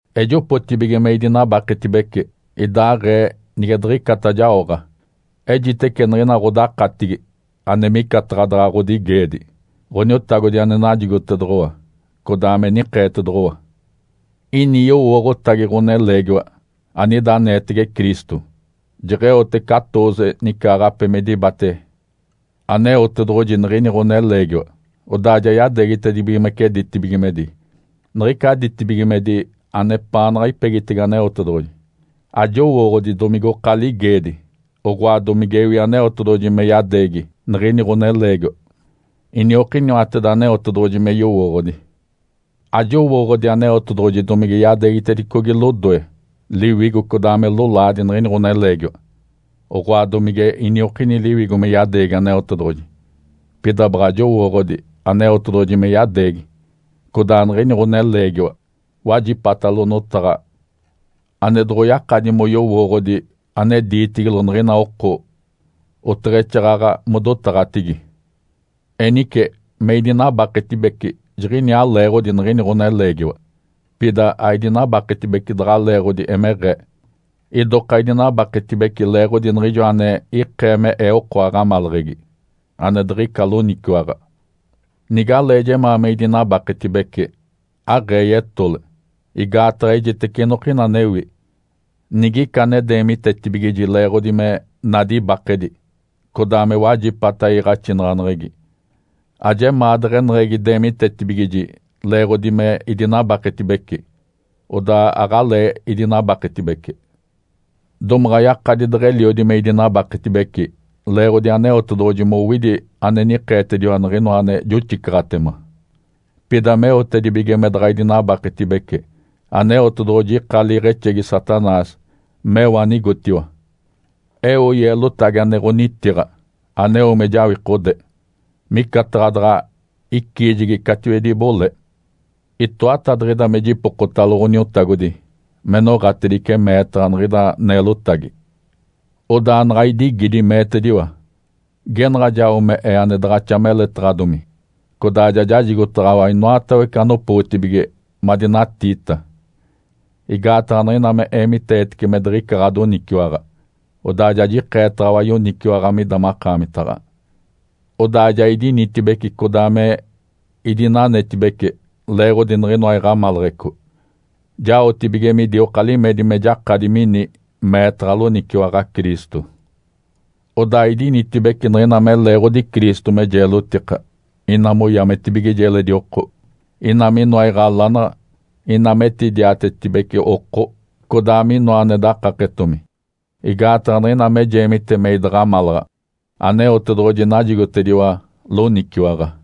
Ejopotibige me idinabaketibece, idaaɡ̶ee nige diɡ̶icata jaoɡ̶a. Ejitece niɡ̶ina ɡ̶odakatigi, ane micataɡ̶a daɡ̶a ɡ̶odigeedi, Ǥoniotagodi ane najigotedoɡ̶owa, codaa me nikeetedoɡ̶owa. Ini yowooɡ̶otagi ɡ̶oneleegiwa anida aneetege Cristo. Jeɡ̶eote catooze nicaaɡ̶ape me dibate Aneotedoɡ̶oji niɡ̶ini ɡ̶oneleegiwa, odaa ja yadeegitedibigimece ditibigimedi, niɡ̶ica ditibigimedi anepaanaɡ̶a ipegitege Aneotedoɡ̶oji. Ajowooɡ̶odi domigoka ligeedi, oɡ̶oa domigewi Aneotedoɡ̶oji me yadeegi niɡ̶ini ɡ̶oneleegiwa. Iniokiniwateda Aneotedoɡ̶oji me yowooɡ̶odi. Ajowooɡ̶odi Aneotedoɡ̶oji domige yadeegitedicogi lodoe, liwigo codaa me lolaadi niɡ̶ini ɡ̶oneleegiwa, oɡ̶oa domige iniokini liwigo me yadeegi Aneotedoɡ̶oji. Pida baɡ̶a jowooɡ̶odi Aneotedoɡ̶oji me yadeegi, codaa niɡ̶ini ɡ̶oneleegiwa wajipatalo notaɡ̶a ane doɡ̶oyakadi moyowooɡ̶odi ane diitigilo niɡ̶ina oko, oteɡ̶exaaɡ̶aɡ̶a modotaɡ̶atigi. Enice me idinabaketibece jiɡ̶iniaa leeɡ̶odi niɡ̶ini ɡ̶oneleegiwa. Pida aidinabaketibece daɡ̶a leeɡ̶odi emeɡ̶ee. Idoka idinabaketibece leeɡ̶odi niɡ̶ijo ane ikee me ee oko aɡ̶amaleɡ̶egi, ane diɡ̶ica loniciwaɡ̶a. Nigalee jemaa me idinabaketibece, aɡ̶ee yetole, igaataɡ̶a ejitece inokina anewi. Nigica ane deemitetibigiji leeɡ̶odi me nadi ibakedi, codaa me wajipata iiɡ̶axinaɡ̶aneɡ̶egi, ajemaa deɡ̶eneɡ̶egi deemitetibigiji leeɡ̶odi me idinabaketibece. Odaa aɡ̶alee idinabaketibece. Domaɡ̶a yakadi deɡ̶eliodi me idinanetibece leeɡ̶odi Aneotedoɡ̶oji mowidi ane nikeetediwa niɡ̶inoa ane joxicaɡ̶atema. Pida meotedibige me daɡ̶a idinanetibece, Aneotedoɡ̶oji ika liiɡ̶exegi Satanás meo anigotiwa. Eo yeelotagi ane ɡ̶onitiɡ̶a, aneo me jawikode, micataɡ̶a daɡ̶a iciijegi catiwedi ibole. Itoatadiɡ̶ida me jipokotalo Ǥoniotagodi me noɡ̶atedice meetaɡ̶a niɡ̶ida neelotagi. Odaa naɡ̶a idigidi, meetediwa, “Genaɡ̶a jao me Ee ane daɡ̶axa meletaɡ̶adomi, codaa ja jajigotedaɡ̶awa inoatawece anopootibige madinatiita. Igaataɡ̶a niɡ̶ina me eemiteetece me diɡ̶ica ɡ̶adoniciwaɡ̶a, odaa ja jikeetaɡ̶awa yoniciwaɡ̶a mida makaamitaɡ̶a.” Odaa ja idinitibeci codaa me idinanetibece leeɡ̶odi niɡ̶inoa iɡ̶amaleɡ̶eco, jaotibige midioka limedi me jakadi mini meetaɡ̶a loniciwaɡ̶a Cristo. Odaa idinitibeci niɡ̶ina me leeɡ̶odi Cristo me jeelotika, ina moyametibigiji eledi oko, ina minoa iɡ̶alanaɡ̶a, ina metidiatetibeci oko, codaa minoa ane dakaketomi. Igaataɡ̶a niɡ̶ina me jeemite me idaɡ̶amalaɡ̶a, Aneotedoɡ̶oji najigotediwa loniciwaɡ̶a.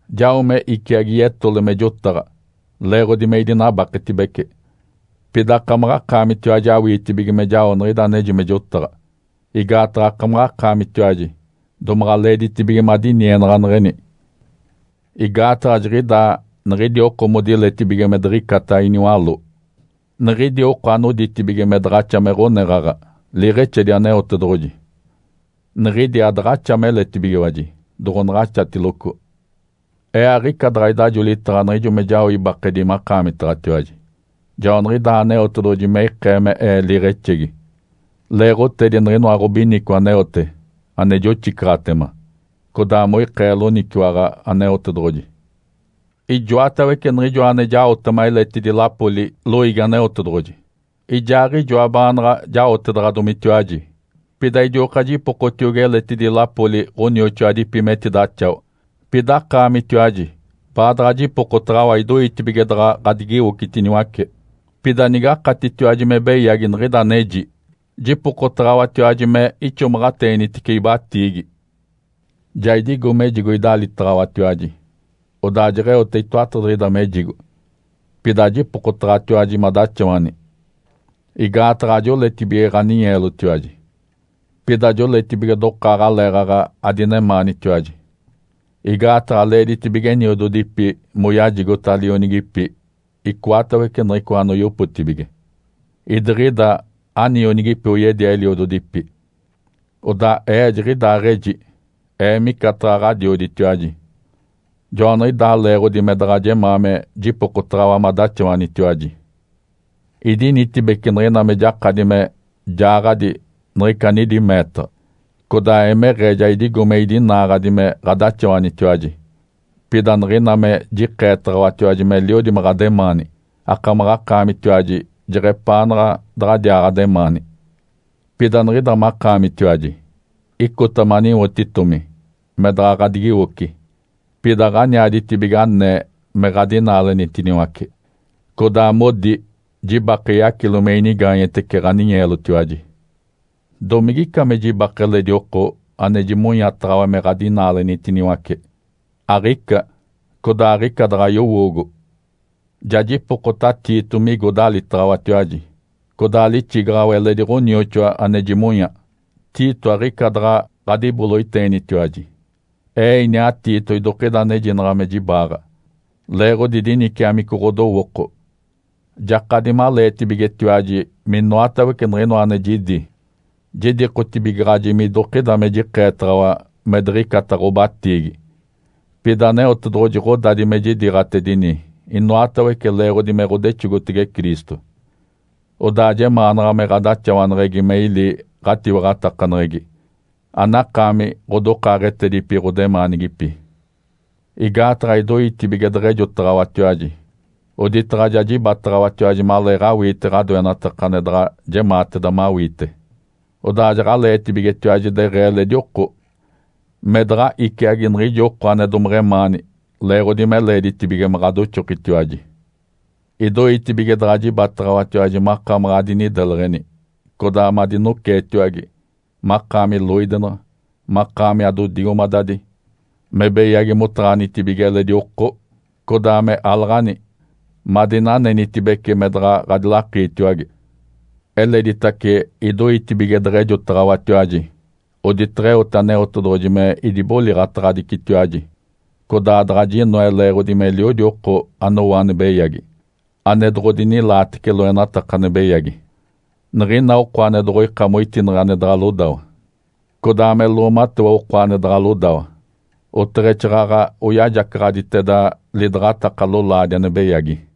Jao me iciagi yetole me jotaɡ̶a, leeɡ̶odi me idinabaketibece. Pida akamaɡ̶akaamitiwaji awiitibige me jao niɡ̶ida aneji me jotaɡ̶a. Igaataɡ̶a akamaɡ̶akaamitiwaji domaɡ̶a leeditibige madinienaɡ̶aneɡ̶eni. Igaataɡ̶a jiɡ̶idaa niɡ̶idi oko modiletibige me diɡ̶icata iniwaló, niɡ̶idi oko anoditibige me daɡ̶axa me ɡ̶oneɡ̶aɡ̶a liiɡ̶exedi Aneotedoɡ̶oji, niɡ̶idi adaɡ̶axa meletibigiwaji doɡ̶onaɡ̶axatiloco. Ee aɡ̶ica daɡ̶a idajolitaɡ̶a niɡ̶ijo me jao ibakedi makaamitaɡ̶atiwaji. Joaniɡ̶idaa Aneotedoɡ̶oji me ikee me ee liiɡ̶exegi, leeɡ̶otedi niɡ̶inoa ɡ̶obinico aneote, ane joxicaɡ̶atema, codaa moikee loniciwaɡ̶a Aneotedoɡ̶oji. Ijoatawece niɡ̶ijo ane jaotema eletidi lapoli loiigi Aneotedoɡ̶oji, ijaaɡ̶ijoa baanaɡ̶a jaotedaɡ̶adomitiwaji. Pida idioka jipokotiogi eletidi lapoli ɡ̶onioxoadipi metidaxawa, pida akaamitiwaji baadaɡ̶a jipokotaɡ̶awa idoitibige daɡ̶a ɡ̶adigiwocitiniwace. Pida nigakatitiwaji me beyagi niɡ̶ida aneji, jipokotaɡ̶awatiwaji me ixomaɡ̶ateenitice ibatiigi. Ja idigo mejigo idalitaɡ̶awatiwaji, odaa jeɡ̶eote itoatadiɡ̶ida mejigo. Pida ajipokotaɡ̶awatiwaji madaxawani. Igaataɡ̶a ajoletibige ɡ̶aninyeelotiwaji, pida joletibige dokaaɡ̶aleeɡ̶aɡ̶a ademaanitiwaji. Igaataɡ̶a leeditibige eniododipi moyajigota lionigipi icoatawece niɡ̶icoa anoyopotibige, idiɡ̶ida anionigipi oyedia eliododipi. Odaa ee jiɡ̶idaaɡ̶eji ee micataɡ̶a ɡ̶adioditiwaji. Joaniɡ̶idaa leeɡ̶odi me daɡ̶a jemaa me jipokotaɡ̶awa madaxawanitiwaji. Idinitibeci niɡ̶ina me jakadi me jaaɡ̶adi niɡ̶ica anidi meetaɡ̶a, codaa emeɡ̶ee ja idigo me idinaaɡ̶adi me ɡ̶adaxawanitiwaji. Pida niɡ̶ina me jikeetaɡ̶awatiwaji meliodi me ɡ̶ademaani, akamaɡ̶akaamitiwaji jeɡ̶epaanaɡ̶a daɡ̶adiaa ademaani. Pida niɡ̶ida makaamitiwaji, icota maniwotitomi me daɡ̶a ɡ̶adigiwoci. Pida aɡ̶aniaditibige anee me ɡ̶adinaalenitiniwace, codaa modi jibake yacilo me inigaanyetece ɡ̶aninyeelotiwaji. Domigica me jibake eledi oko ane jimonyataɡ̶awa me ɡ̶adinaalenitiniwace? Aɡ̶ica, codaa aɡ̶ica daɡ̶a yowoogo! Ja jipokota Tito migo dalitaɡ̶awatiwaji, codaa lixigaɡ̶awa eledi ɡ̶onioxoa ane jimonya. Tito aɡ̶ica daɡ̶a ɡ̶adiboloiteenitiwaji. Ee iniaa Tito idokida anejinaɡ̶a me jibaaɡ̶a, leeɡ̶odi diniciamico ɡ̶odowooko. Jakadi maleetibigetiwaji minoatawece niɡ̶inoa ane jidi, jidikotibigaɡ̶aji midokida me jikeetaɡ̶awa me diɡ̶icata ɡ̶obatiigi. Pida Aneotedoɡ̶oji ɡ̶odadi me jidiiɡ̶atedini inoatawece leeɡ̶odi me ɡ̶odexogotege Cristo, odaa jemaanaɡ̶a me ɡ̶adaxawaneɡ̶egi me ili ɡ̶atiwaɡ̶atakaneɡ̶egi, anakaami ɡ̶odokaaɡ̶etedipi ɡ̶odemaanigipi. Igaataɡ̶a idoitibige deɡ̶ejotaɡ̶awatiwaji, oditaɡ̶a ja jibataɡ̶awatiwaji maleeɡ̶awiite ɡ̶adoenataka ane daɡ̶a jemaateda mawiite. Odaa jaɡ̶aleetibigetiwaji deɡ̶ee eledi oko, me daɡ̶a iciagi niɡ̶ijo oko ane domeɡ̶emaani leeɡ̶odi me leeditibige me ɡ̶adoxokitiwaji. Idoitibige daɡ̶a jibataɡ̶awatiwaji makamaɡ̶a adinideleɡ̶eni, codaa madinoceetiwage, makaami loidenaɡ̶a, makaami adodigomadadi, me beyagi motaɡ̶anitibige eledi oko, codaa me alaɡ̶ani, madinanenitibece, me daɡ̶a ɡ̶adilakiitiwage. Eleditace idoitibige deɡ̶ejotaɡ̶awatiwaji, oditeɡ̶eote Aneotedoɡ̶oji me idiboliɡ̶ataɡ̶adicitiwaji, codaa daɡ̶a jinoe leeɡ̶odi meliodi oko anowo ane beyagi, ane doɡ̶odinilaatece loenataka ane beyagi. Niɡ̶ina oko ane doɡ̶oika moitineɡ̶e ane daɡ̶a lodawa, codaa me loomatewa oko ane daɡ̶a lodawa, oteɡ̶exaaɡ̶aɡ̶a oyajacaɡ̶aditeda lidaɡ̶ataka lolaadi ane beyagi.